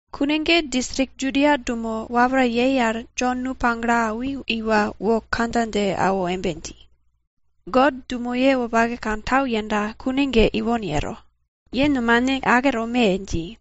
Kune ge distrik Judia dumo wapra yei al Jon nu pagle awi iwa wo kandja dje awo embe dji, God dumoye wopake kantau yenda kune ge ipon yero. Ye nomane ake tome! dji.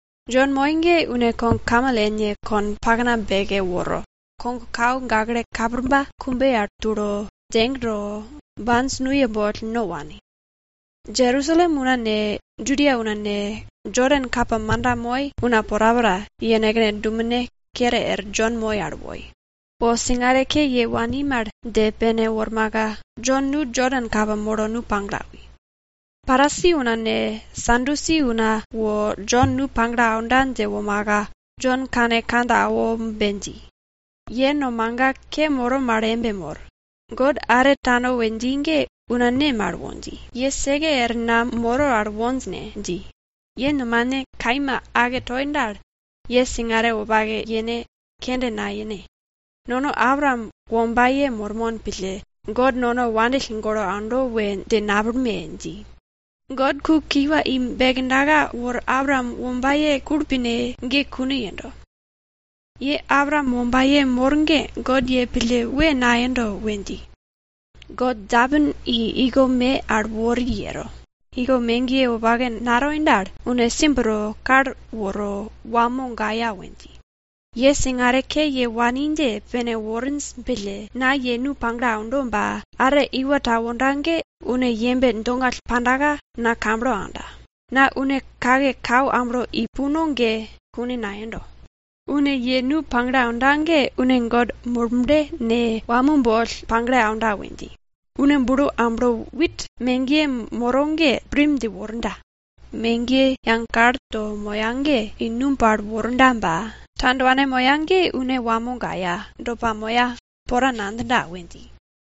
Jon moi ge une kogkamel ene konpakna beke woro, kogkau gakle kapirba kumbe al tulo, djeg to, bi nuye boll no wani. Jerusalem una ne, Judia una ne, Jodan kapa manda moi una porapora, yenekne dumene kere er Jon moi al woi. Wo singare ke ye wani mal dje pene wormaka, Jon nu Jodan kapa molo nu pagle awi. Parisi una ne, Sadusi una wo Jon nu pagle aunda dje womaka, Jon kane kandja awo embe dji, ye nomaga ke moro mal embe mor. God are tano we dji ge una ne mal wo dji, ye seke er na moro al wonj ne? dji. Ye nomane kaima ake toi dal, ye singare wopake yene, kende nayene. Nono Abraam wombaye mormon pille God nono wandill golo aundo we dje napillme! dji. God ku kiwa i bekdaka wor Abraam wombaye kulpine ge kune yendo. Ye Abraam wombaye mor mal ge God pille pla nayendo we dji. God djeapin i iko me al wori yero. Iko megiye wopake natoi dal, une simb to kal woro wamo gaya we dji. Ye singare ke ye wani dje pene worinj pille, na ye nu pagle aundo ba, are iwa ta wonda ge une yembe dongall pa na kamblo aunda. Na une kake su amblo i puno ge kune nayendo. Une ye nu pagle aunda ge une God Murble ne, wamo boll pagle aunda we dji. Une bulo amblo wit megiye moro ge sek tonda. Megiye yage kal to moya ge une i numb al mogiya ba, tandwane moya ge une wamo gaya, do pamoya, pora nadjinda we dji.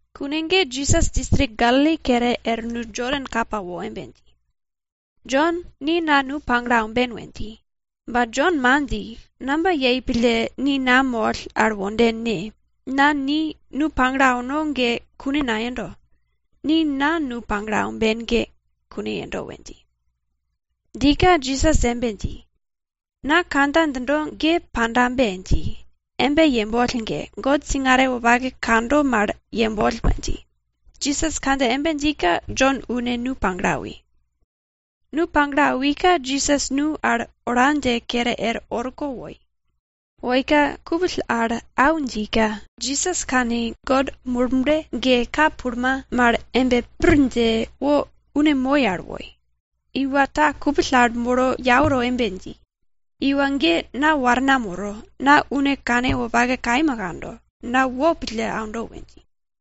Kune ge Jisas distrik Galili kere er nu Jodan kapa wo embe dji, Jon ni na nu pagle aumben we dji. Ba Jon man dji, namba yei pille ni na moll al wonden ne? Na ni nu pagle auno ge kune nayendo. Ni na nu pagle aumben ge kune yendo we dji. Djika Jisas embe dji, na kandja djindo ge pandabe dji. Embe yemboll ge, God singare wopake kando mal yemboll we dji. Jisas kandja embe djika Jon une nu pagle awi. Nu pagle awika Jisas nu al ola dje kere er orko woi. Woika kupill al au djika, Jisas kani God Murble ge ka pulma mal embe pir dje wo une moi al woi. Una ta kupill al molo yau to embe dji, iwa ge na warna moro. Na une kanwopake kaima kando, na wopake pille aundo we dji.